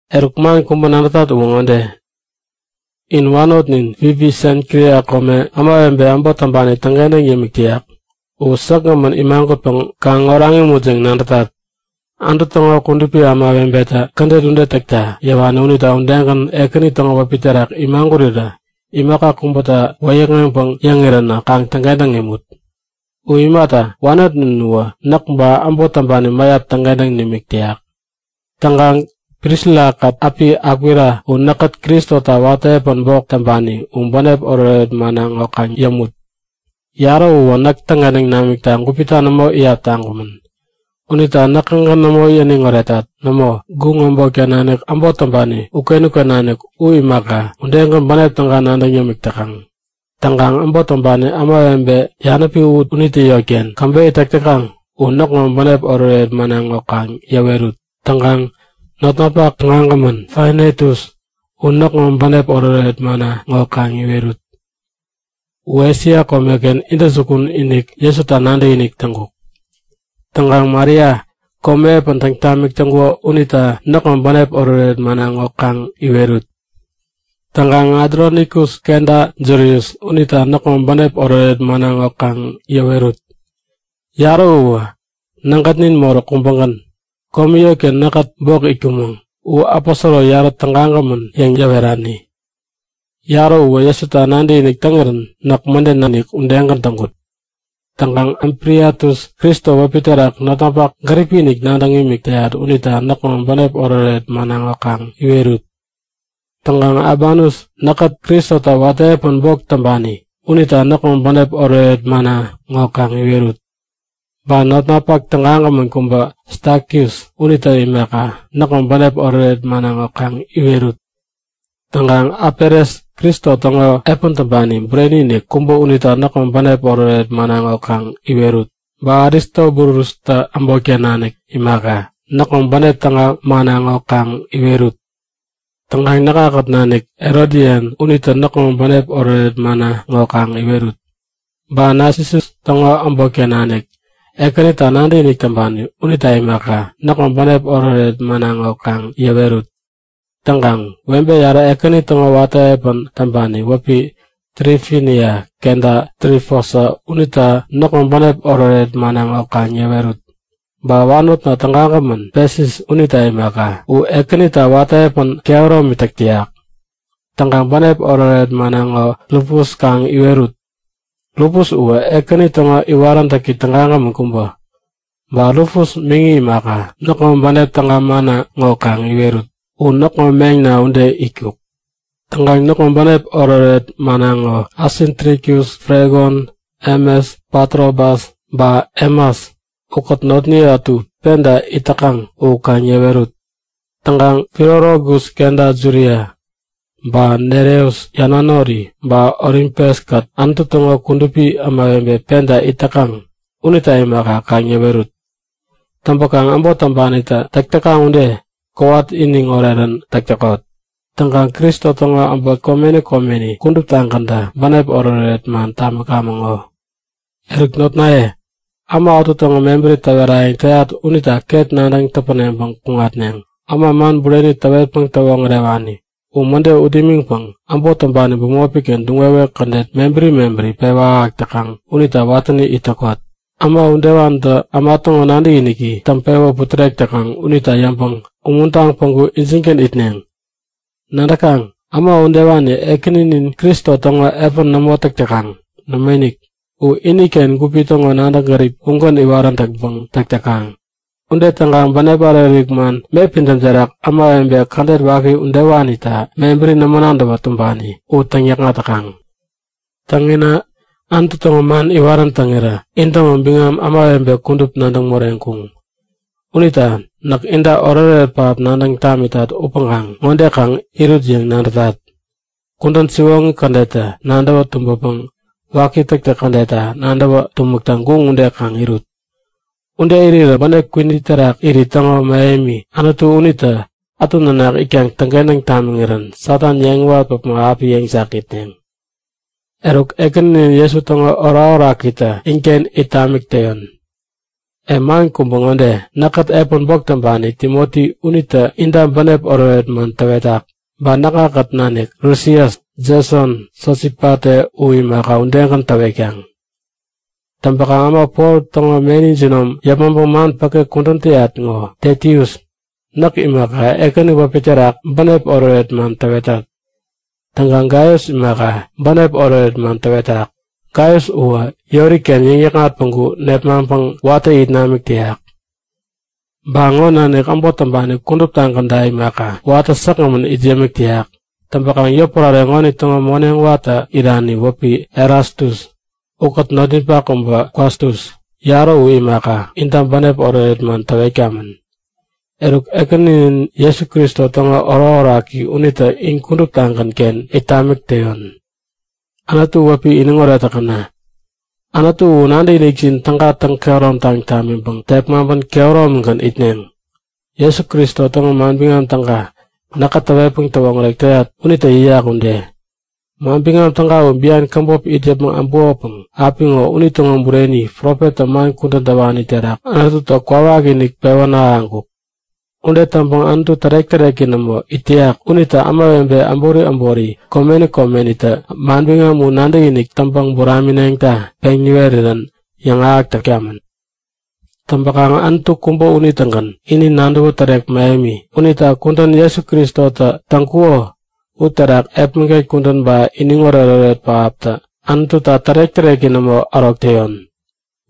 Eruk man kubä nadätat uwä ŋode; In wanotnin Fibi, Senkria kome ämawebe äbot täŋpani täŋkentäŋ yämik täyak u säkgämän imagutpäŋ kaŋ oraŋ imut yäŋ nadätat. Anutu täŋo kudupi ämawebetä kädet ude täkta yäwani unita udegän Ekäni täŋo wäpi terak imagurirä imaka kubäta wäyäkŋeŋpäŋ yäŋiränä kaŋ täŋkentäŋ imut. U imata, wanotnin uwä näk ba äbot täŋpani mäyap täŋkentäŋ nimik täyak. Täŋkaŋ Prisila-kät äpi Akwila, u näkkät Kristota watä epän bok täŋpani u bänep oretoret manna ŋo kaŋ yämut. Yarä uwä näk täŋkentäŋ namikta gupita nämo iyap taŋkumän. Unita näkägän nämo yäniŋ oretat. Nämo, guŋ äbotken nanik äbot täŋpani uken-uken nanik u imaka, udegän bänep täga nadäŋ yämik täkaŋ. Täŋkaŋ äbot täŋpani ämawebe yanäpi unitä yotken käbeyä täk täkaŋ u näkŋo bänep oretoret manna ŋo kaŋ yäwerut. Täŋkaŋ notnapak tägagämän Epainetus u näkŋo bänep oretoret manna ŋo kaŋ iwerut. U Esia komeken intäjukun-inik Jesuta nadäkinik täŋkuk. Täŋkaŋ Maria, komi epän täŋ tamik täŋkuko unita näkŋo bänep oretoret manna ŋo kaŋ iwerut. Täŋkaŋ Adronikus kenta Julius unita näkŋo bänep oretoret manna ŋo kaŋ yäwerut. Yarä uwä nägätnin moräk kubägän, komi yotken näkkät bok itkumäŋ. U aposoro yarä tägagämän yäŋ yäwerani. Yarä uwä Jesuta nadäkinik täŋirän näk mäden nadäkinik udegän täŋkut. Täŋkaŋ Ampliatus, Kristo wäpi terak notnapak gäripi-inik nadäŋ imik täyat unita näkŋo bänep oretoret manna ŋo kaŋ iwerut. Täŋkaŋ Abanus, näkkät Kristota watä epän bok täŋpani unita näkŋo bänep oretoret manna ŋo kaŋ iwerut. Ba notnapak tägagämän kubä Stakis unita imaka, näkŋo bänep oretoret manna ŋo kaŋ iwerut. Täŋkaŋ Apeles, Kristo täŋo epän täŋpani bureni-inik kubä unita näkŋo bänep oretoret manna ŋo kaŋ iwerut. Ba Aristobulustä äbotken nanikta imaka, näkŋo bänep täga manna ŋo kaŋ iwerut. Täŋkaŋ näkŋakät nanik Herodian unita näkŋo bänep oretoret manna ŋo kaŋ iwerut. Ba Nasisus täŋo äbotken nanik Ekänita nadäkinik täŋpani unita imaka, näkŋo bänep oretoret manna ŋo kaŋ yäwerut. Täŋkaŋ webe yarä Ekäni täŋo watä epän täŋpani wäpi Trifinia kenta Trifosa unita näkŋo bänep oretoret manna ŋo kaŋ yäwerut. Ba wanotna tägagämän Pesis unita imaka. U Ekänita watä epän kehäromi täk täyak. Täŋkaŋ bänep oretoret manna ŋo Rufus kaŋ iwerut. Rufus uwä Ekäni täŋo iwaräntäki tägagämän kubä. Ba Rufus miŋi imaka, näkŋo bänep täga manna ŋo kaŋ iwerut. U näkŋo meŋna ude itkuk. Täŋkaŋ näkŋo bänep oretoret manna ŋo Asinkritus, Flegon, Hemes, Patrobas ba Hemas ukät notniye ätu penta it täkaŋ u kaŋ yäwerut. Täŋkaŋ Filologus kenta Julia ba Nereus yanwanori, ba Olimpes-kät Anutu täŋo kudupi ämawebe penta it täkaŋ unita imaka kaŋ yäwerut. Täŋpäkaŋ äbot täŋpanitä täk täkaŋ ude kowat iniŋ orerän täk täkot. Täŋkaŋ Kristo täŋo äbot komeni komeni kuduptagäntä bänep oretoret man tamikaŋ ŋo. Eruk notnaye, äma ätu täŋo mebäri täwerayäŋ täyat unita ket nadäŋ täpäneŋpäŋ kuŋatneŋ; Äma man bureni täwetpäŋ täwoŋärewani u mäde ut imiŋpäŋ äbot täŋpani bämopi-ken duŋ-wewek kädet mebäri mebäri pewä ahäk täkaŋ unita watäni it täkot. Äma udewanitä äma täŋo nadäkiniki täŋpewä putärek täkaŋ unita yabäŋ umuntaŋ päŋku injingän itneŋ. Nadäkaŋ, äma udewani Ekäninin Kristo täŋo epän nämo täk täkaŋ. Nämoinik, u iniken gup täŋo nadäŋ gärip ugänpäŋ iwarän täŋpäŋ täk täkaŋ. Ude täŋkaŋ bänep ärik-ärik man me pidäm terak ämawebe kädet waki udewanita mebäri nämo nadäwä tumbani u täŋyäkŋat täkaŋ. Täŋ, inä Anutu täŋo man iwarän täŋirä intäŋo biŋam ämawebe kudup nadäŋ moreŋkuŋ. Unita näk inta oretoret pähap nadäŋ tamitat upäŋkaŋ ŋode kaŋ irut yäŋ nadätat; Kudän siwoŋi kädetta nadäwä tumbäpäŋ waki täktäk kädetta nadäwä tumäkta guŋ ude kaŋ irut. Ude irirä bänep kwini terak irit täŋo mähemi Anutu unitä ätu nanak itkaŋ täŋkentäŋ tamiŋirän Satan yeŋiwat päpmo api yeŋjakŋitneŋ. Eruk Ekäninin Jesu täŋo orakorakitä inken it tamik täyon. E man kubä ŋode; Näkkät epän bok täŋpani Timoti unitä inta bänep oretoret man täwetak. Ba näkŋakät nanik Lusias, Jeson, Sosipate u imaka udegän, täwetkaŋ. Täŋpäkaŋ äma Pol täŋo meni jinom yäpmäŋpäŋ man päke kudän täyat ŋo, Tetius näk imaka, Ekäni wäpi terak bänep oretoret man täwetat. Täŋkaŋ Gaius imaka, bänep oretoret man täwetak. Gaius uwä yori-ken yäŋnäkŋat päŋku nepmaŋpäŋ watä it namik täyak, ba ŋo nanik äbot täŋpani kuduptagänta imaka, watä säkgämän it yämik täyak. Täŋpäkaŋ yotpärare ŋonitäŋo moneŋ watä irani wäpi Erastus ukät notninpak kubä Kwatus, yarä u imaka, inta bänep oretoret man täwetkamän. Eruk Ekäninin Jesu Kristo täŋo orakoraki unitä in kuduptagän-ken it tamik täyon. Anutu wäpi iniŋoret täkäna! Anutu u nadäkinikjin täga täŋ-kehäromtaŋ tamiŋpäŋ tepmaŋpän kehäromigän itneŋ, Jesu Kristo täŋo Manbiŋam Täga, näkä täwetpäŋ täwoŋärek täyat unitä yäyak ude. Manbiŋam Täga u bian käbop it yäpmäŋ äbukopäŋ apiŋo unitäŋo bureni profettä man kudän täwani terak Anututä kwawakinik pewän ahäŋkuk. Ude täŋpäŋ Anutu tärek-täreki nämo it täyak unitä ämawebe äbori äbori komeni komenitä manbiŋam u nadäkinik täŋpäŋ buramineŋta peŋ niwerirän yäŋahäk täkamäŋ. Täŋpäkaŋ Anutu kubä unitägän ini nadäwä tärek mähemi. Unita kudän Jesu Kristotä täŋkuko uterak epmäget kudän ba iniŋ oretoret pähaptä Anututa tärek-täreki nämo ärok täyon.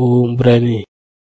U Bureni!